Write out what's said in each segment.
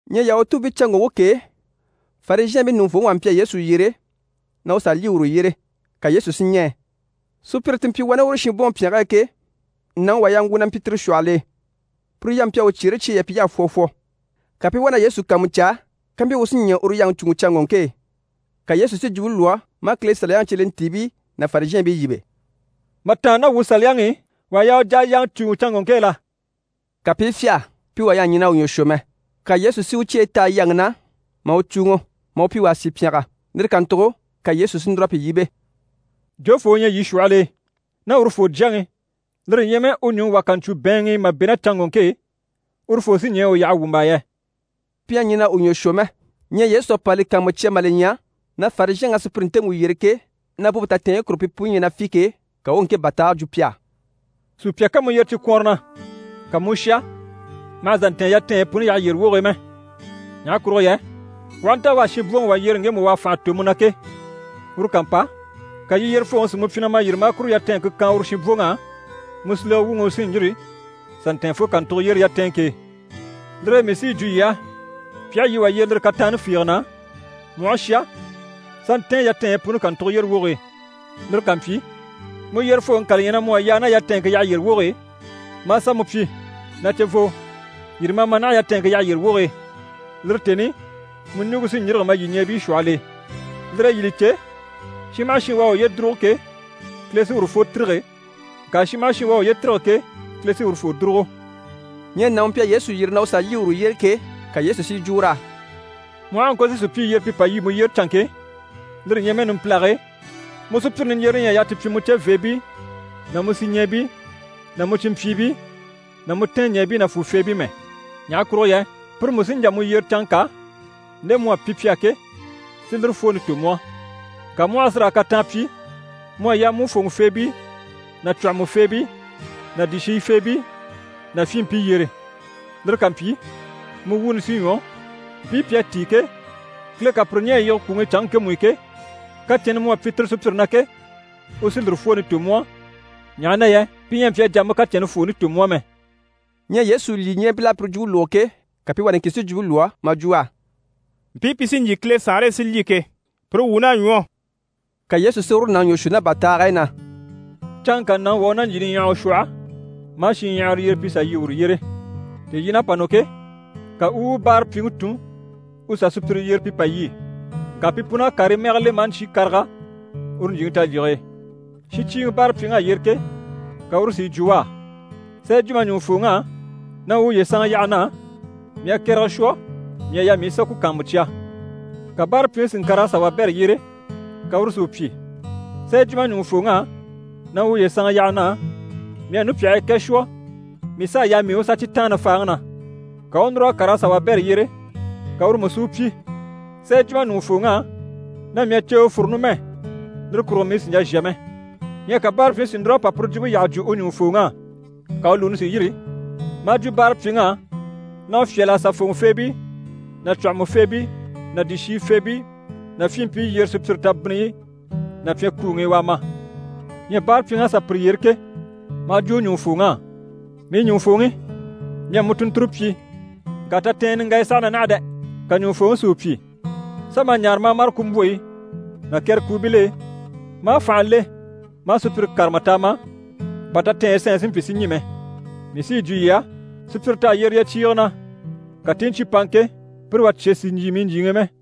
Ɲyɛ Yahutuubiicanŋɔŋke k'e, Farizhɛɛnbii ɲùŋufooŋi wà mpyi a Yesu yyere na u sà lyî uru yyére, ka Yesu si ɲɛɛ. Sùpyire ti mpyi wani uru shinbwoŋi pyɛnge e ke, nàŋi wà yaŋgwu na mpyi tire shwɔhɔl'e, puru yampe mpyi a u cyeere cyeyi yà pyi y'à fwɔ fwɔ. Ka pi i wá na Yesu kàanmucaa kampyi u sí ɲɛɛ uru yaŋi cùuŋɔ canŋɔŋke e. Ka Yesu si jwumpe lwɔ́ maa Kile Saliyaŋi cyelentiibii ná Farizhɛɛnbii yíbe: «Mà tàanna ná wuu Saliyaŋi i, wà à yaa u jà a yaŋa cùuŋɔ canŋɔŋke e la?» Ka pi i fyâha, pi wà ɲyɛ a ɲɛn'a u ɲwɔ shwɔ mɛ. Ka Yesu si u cyeyi taha yaŋi na maa u cùuŋɔ, maa u pyi u a sì pyɛngɛ. Lire kàntugo ka Yesu si núr'a pi yíbe: «Jofoo u ɲyɛ yii shwɔhɔl'e, ná urufoo jyaŋi, lire ɲyɛ mɛ u nùŋi wà ká ɲcwo bɛ̀ɛnŋ'i mà bɛ̂ ná canŋɔŋke e, urufoo sí ɲɛɛ u yaha wwùmbaa yɛ?» Pi ɲyɛ a ɲɛn'a u ɲwɔ shwɔ mɛ. Ɲyɛ Yesu à pa li kàanmucya mà li ɲya na Farizhɛnŋ'à sùpyire ntemu yyere ke, na bwompe tatɛɛnyi kurugo pi puni ɲyɛ na fî ke, ka u u ŋke bàtaage jwo pi á: «Sùpya ká mu yyere cikwɔnrɔ na, ka mu u shà, ma hà zà ntɛ̀ɛn yatɛɛnɲyi puni yyaha yyére woge e mɛ. Ɲaha kurugo yɛ u aha nta u à shinbwoŋi wà yyere ŋgemu u à fànha tò mu na ke, uru ká mpa, ka yii yyerefooŋi si mu pyi, na ma yîri maa kuru yatɛɛnŋke kan uru shinbwoŋ'á, mu silege wuŋi u sí n‑yîri n‑sà n‑tɛ̀ɛn fo kàntugo yyére yatɛɛnŋke e. Lire e mii sí yi jwo yii á, pi aha yii wà yyere lire kataanni fiige na, mu aha shà, sà ntɛ̀ɛn yatɛɛnɲyi puni kàntugo yyére woge e. Lire ká mpyi, mu yyerefooŋi ká li ɲya na mu à yaa ná yatɛɛnŋke yyaha yyére woge e, maa sà mu pyi “Na cevoo, yîri ma a ma naha, yatɛɛnŋke yyaha yyére woge e.” Lire tèni i, mu ɲùŋke sí n‑yîrige ma lyìɲɛɛbii shwɔhɔl'e. Lire e yii li cè, shin maha shin u à uye dùrugo ke, Kile sí urufoo tîrige, ŋka shin maha shin u à uye tîrige ke, Kile sí urufoo dùrugo.» Ɲyɛ nàŋi u mpyi a Yesu yyere na u sà lyî uru yyére ke, ka Yesu si yi jwo ur'á: «Mu aha a ŋko si sùpyii yyere pi pa lyî mu yyére canŋke e, lire ɲyɛ mɛ numpilage e, mu sùpyire niɲjyerere ɲyɛ a yaa ti pyi mu ceveebii ná mu sìɲɛɛbii ná mu cìnmpyiibii ná mu tɛɛnɲɛɛbii nàfuufeebii mɛ. Ɲaha kurugo yɛ pire mú sí n‑jà mu yyere canŋka, nde mu à pyi pi á ke, si lire fwooni tò mu á. Ŋka mu aha sí raa kataan pyi, mu à yaa mu u fòŋɔfeebii ná cwɔ̀hɔmɔfeebii ná dìshiyifeebii ná fyinmpii yyere. Lire ká mpyi, mu wuuni sí ɲwɔ, mpii pi à tíi ke, Kile ká pire ɲɛ̀ a yige kwùŋi i canŋke ŋkemu i ke, kacɛnni mu à pyi tire sùpyire na ke, u sí lire fwooni tò mu á, ɲaha na yɛ pi ɲyɛ a mpyi a jà a mu kacɛnni fwooni tò mu á mɛ.» Ɲyɛ Yesu lyìɲɛɛbil'à puru jwumpe lógo ke, ka pi wà niŋkin si jwumpe lwɔ́ maa jwo u á: «Mpii pi sí n‑jyè Kile Saanre e si lyî ke, pire wuun'à ɲwɔ!» Ka Yesu si uru nàŋi ɲwɔ shwɔ ná bàtaag'e na: «Canŋka nàŋi wà u ná ɲjyì niɲyahawa shwɔhɔ, maa shinɲyahara yyere pi sà lyî uru yyére. Tèelyiin'à pa nɔ ke, ka u u u báarapyiŋi tun u sà sùpyire yyere pi pa lyî. Ŋka pi pun'à karii mɛgɛ le maa ɲcyé karaga uru ɲjyìŋi talyige e. Shincyiiŋi báarapyiŋ'à yyere ke, ka uru si yi jwo u á “Sà yi jwo ma ɲùŋufooŋ'á na u uye sanŋa yaha na á, mii à kɛrɛgɛ shwɔ, mii à yaa mii u sà ku kàanmucya.” Ka báarapyiŋi si ŋkàr'a sà wabɛrɛ yyere, ka uru si u pyi “Sà yi jwo ma ɲùŋufooŋ'á na u uye sanŋa yaha na á, mii à nupyahii kɛ shwɔ, mii s'à yaa mii u sà cyi taanna faaŋi na.” Ka u u núr'a kàr'a sà wabɛrɛ yyere, ka uru mú si u pyi “Sà yi jwo ma ɲùŋufooŋ'á na mii à ceewe fúru numɛ. Lire kurugo mii sì n‑jà n‑shà mɛ.” Ɲyɛ ka báarapyiŋi si núr'a pa puru jwumpe yyaha jwo u ɲùŋufooŋ'á. Ka u lùuni si yîri, maa jwo báarapyiŋ'á na u fyâl'a sà fòŋɔfeebii ná cwɔ̀hɔmɔfeebii ná dìshiyifeebii ná fyinmpii yyere, sùpyire tabinniyi ná pyɛnkuuŋi i, u a ma. Ɲyɛ báarapyiŋ'à sà pire yyere ke, maa jwo u ɲùŋufooŋ'á “Mii ɲùŋufooŋi, mii à mu tùnnture pyi ŋka tatɛɛnyɛ niŋgaya saha na naha dɛ!” Ka ɲùŋufooŋi si u pyi “Sà ma a ɲaare ma a mâre kumbwoyi ná kɛrɛkuubil'e, ma a fànha le ma a sùpyire kárama t'a ma, bà tatɛɛnyi sanɲyi si mpyi si ɲî mɛ. Mii sí yi jwo yii á, sùpyire t'à yyere yyecyiige na, ka ti i ɲcyé paŋa ke, pire wà cye sì n‑jyè mii ɲjyìŋi i mɛ.”»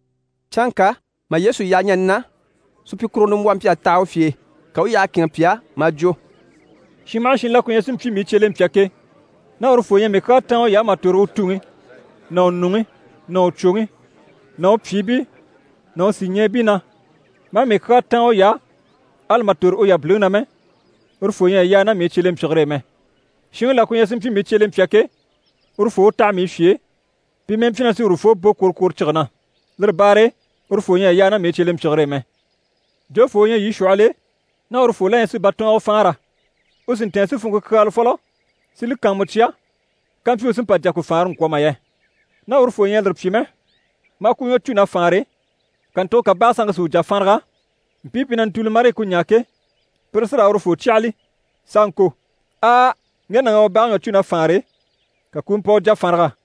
Canŋka mà Yesu yaha ɲani na, supyikuruŋɔ nimbwɔhɔ mpyi a taha u fye e. Ka u u yyaha kɛ̂ɛnŋɛ pi á, maa jwo: «Shin maha shin la ku ɲyɛ si mpyi mii cyelempya ke, ná urufoo ɲyɛ a mii kyaa táan uy'á mà tòro u tuŋi ná u nuŋi ná u cwoŋi ná u pyìibii ná u sìɲɛɛbii na, maa mii kyaa táan uy'á, ali mà tòro u yabiliŋi na mɛ, urufoo ɲyɛ a yaa ná mii cyelempyigire e mɛ. Shinŋi la ku ɲyɛ si mpyi mii cyelempya ke, urufoo u taha mii fye e, pi mɛ́ɛ mpyi na sí urufoo bò kworokworocige na. Lire baare e urufoo ɲyɛ a yaa ná mii cyelempyigire e mɛ. Jofoo u ɲyɛ yii shwɔhɔl'e, ná urufoo la ɲyɛ si batɔɔngɔ faanra, u sì n‑tɛ̀ɛn si funŋke kyaala fɔlɔ, si li kàanmucya kampyi u sí n‑pa n‑jà ku faanra n‑kwɔ̀ mà yɛ? Ná urufoo ɲyɛ a lire pyi mɛ, maa ku ɲwɔ cû na faanre, kàntugo ka bage sanŋke si u jà faanraga, mpii pi na ntùuli marii ku ɲaa ke, pire sí raa urufoo cyàhali, s'a ŋko: “Aa! Ŋge nàŋ'à u bage ɲwɔ cû na faanre, ka ku u mpa u jà faanraga.”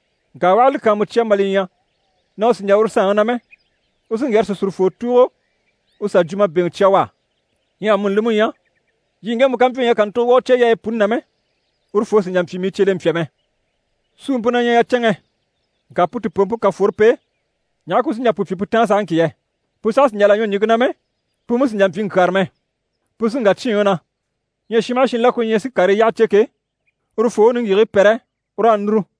Ŋka u aha li kàanmucya mà li ɲya na u sì n‑jà uru saanŋi na mɛ, u sí n‑wyɛ̀rɛ sìsurufoo tùugo u sà jwumabeŋɛ cya u á. Ɲyɛ amuni li mú ɲyɛ, yii ŋgemu ká mpyi u ɲyɛ a kàntugo wà u cyeyaayi puni na mɛ, urufoo sì n‑jà n‑pyi mii cyelempya mɛ. Suumpe na ɲyɛ yacɛnŋɛ. Ŋka pu tìpoompe ká fworo p'e, ɲaha ku sí n‑jà pu pyi pu táan sahaŋki yɛ? Pu saha sì n‑jà là ɲwɔ ɲìŋke na mɛ, pu mú sì n‑jà n‑pyi ŋkyàra mɛ. Pu sí n‑wà cyíinŋi na. Ɲyɛ shin maha shin la ku ɲyɛ si karii yyaha cè ke, urufoo u niŋgyigigii pɛrɛ, u raa núru.»